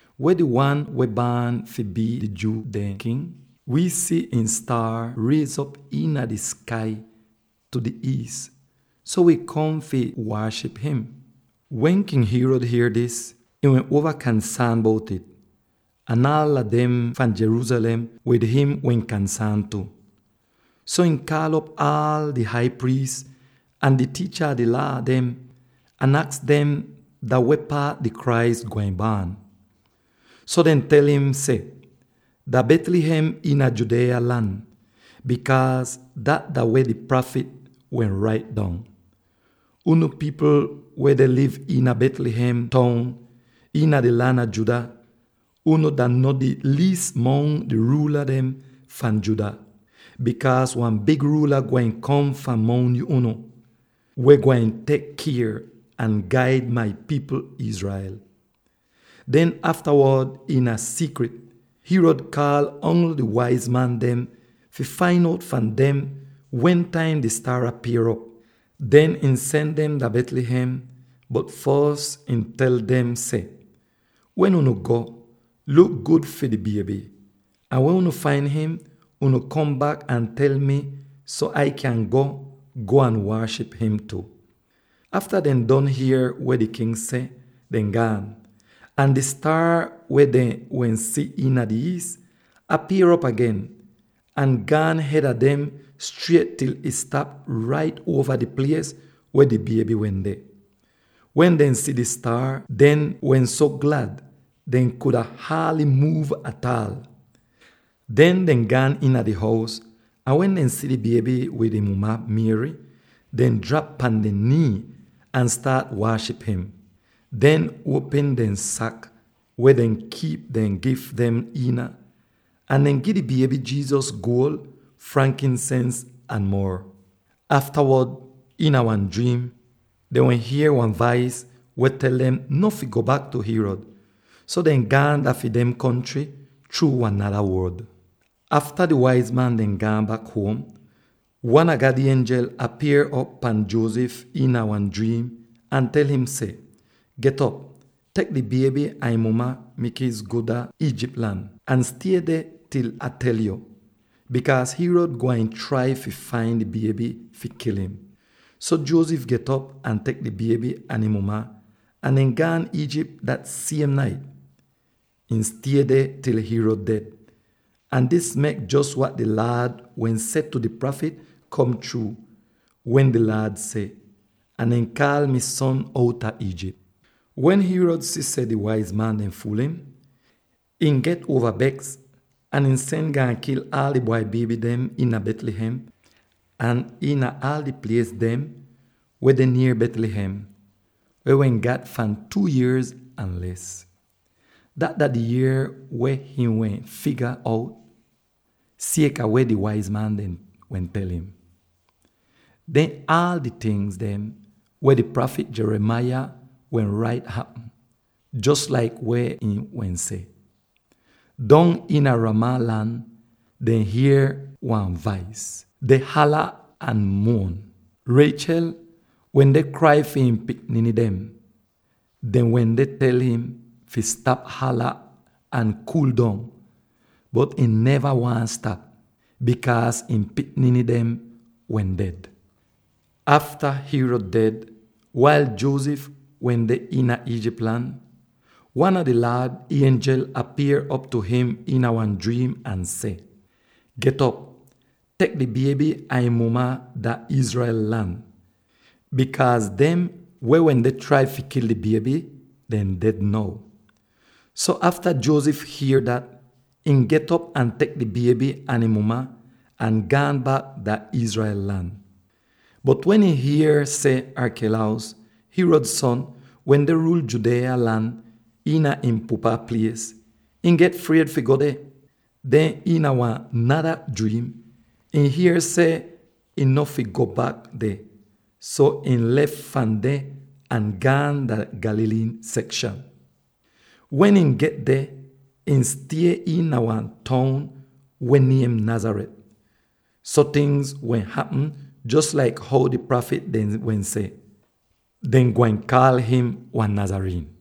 “Weh di Wan wehn baan fi bii di Jew dehn king? Wii si ihn staar riez'op iina di skai tu di iis, so wi kom fi waaship im.” Wen King Herod hier dis, ihn wehn uova kansaan bout'ih, ahn aala dem fahn Jerusalem wid im wehn kansaan tu. So, ihn kaal'op aal di hai priis ahn di tiicha a di Laa dem ahn aks dem dah weh paat di Christ gwain baan. So dehn tel im seh, “Dah Bethlehem iina Judea lan; bikaaz dat dah weh di prafit wehn rait dong: ‘Unu pipl weh deh liv iina Bethlehem toun iina di lan a Judah, unu dah no di liis mongs di ruula dem fahn Judah; bikaaz wan big ruula gwain kom fahn mongs unu, weh gwain tek kier ahn gaid mai pipl Israel.’” Den aftawod iina siikrit, Herod kaal ongl di waiz man dem fi fain out fahn dem wentaim di staar apier'op. Den ihn sen dem dah Bethlehem; bot fos ihn tel dem seh, “Wen unu go, luk gud fi di bieby. Ahn wen unu fain im, unu kom bak ahn tel mi, so Ah kyan go, go waaship im tu.” Afta dehn don hier weh di king seh, dehn gaan, ahn di staar weh dehn wehn si iina di iis, apier'op agen, ahn gaan hed a dem striet til'ih stap rait uova di plies weh di bieby wende. Wen dehn si di staar, dehn wehn so glad dehn kuda haaly muuv ataal. Den dehn gaan iina di hous, ahn wen dehn si di bieby wid ihn muma Mary, dehn drap pan dehn nii ahn staat waaship im. Dehn uopm dehn sak, weh dehn kiip dehn gif dem iina, ahn dehn gi bieby Jesus guol, frankinsens, ahn mor. Aftawod iina wan driim dehn wehn hier wan vais weh tel dem no fi go bak tu Herod, so dehn gaan dah fi dem kontry chruu wan nada ruod. Afta di waiz man dem gaan bak huom, wan a God ienjel apier'op pahn Joseph iina wan driim ahn tel im seh, “Get'op, tek di bieby ahn ihn muma; mikies go dah Egypt lan. Ahn stie deh til Ah tel yo, bikaaz Herod gwain trai fi fain di bieby fi kil im.” So Joseph get'op ahn tek di bieby ahn ihn muma, ahn dehn gaan dah Egypt dah siem nait. Ihn stie deh til Herod ded, ahn dis mek jos wat di Laad wehn seh tu di prafit kom chruu, wen di Laad seh, “Ah deh kaal mi son outa Egypt.” Wen Herod si seh di waiz man dem fuul im, ihn get uova beks ahn ihn sen gaan kil aal di bwai bieby dem iina Bethlehem ahn iina aal di plies dem weh deh nier Bethlehem weh wehn gat fahn two yier ahn les. Dat dah di yier weh him wehn figa out, sieka weh di waiz man dem wehn tel im. Den aal di tingz weh di prafit Jeremiah wehn rait hapm, jos laik weh ihn wehn seh, “Dong iina Ramah lan dehn hier wan vais, deh hala ahn muon. Rachel wende krai fi ihn pikniny dem. Dehn wende tel im fi stap hala ahn kuul dong, bot ihn neva waahn stap, bikaaz ihn pikniny dem wehn ded.” Afta Herod ded, wail Joseph wehn deh iina Egypt lan, wan a di Laad ienjel apier'op tu im iina wan driim ahn seh, “Get'op; tek di bieby ahn ihn muma dah Israel lan, bikaaz dem weh wende trai fi kil di bieby, dehn ded now.” So afta Joseph hier dat, ihn get'op ahn tek di bieby ahn ihn muma, ahn gaan bak dah Israel lan. Bot wen ihn hier seh Archelaus, Herod son, wende ruul Judea lan iina ihn pupa plies, ihn get fried fi go deh. Den iina wan nada driim, ihn hier seh ihn no fi go bak deh, so ihn lef fahn deh ahn gaan dah di Galilee sekshan. Wen ihn get deh, ihn stie iina wan toun weh niem Nazareth, so tingz wehn hapm jos laik how di prafit dem wehn seh, “Dehn gwain kaal im wan Nazarene.”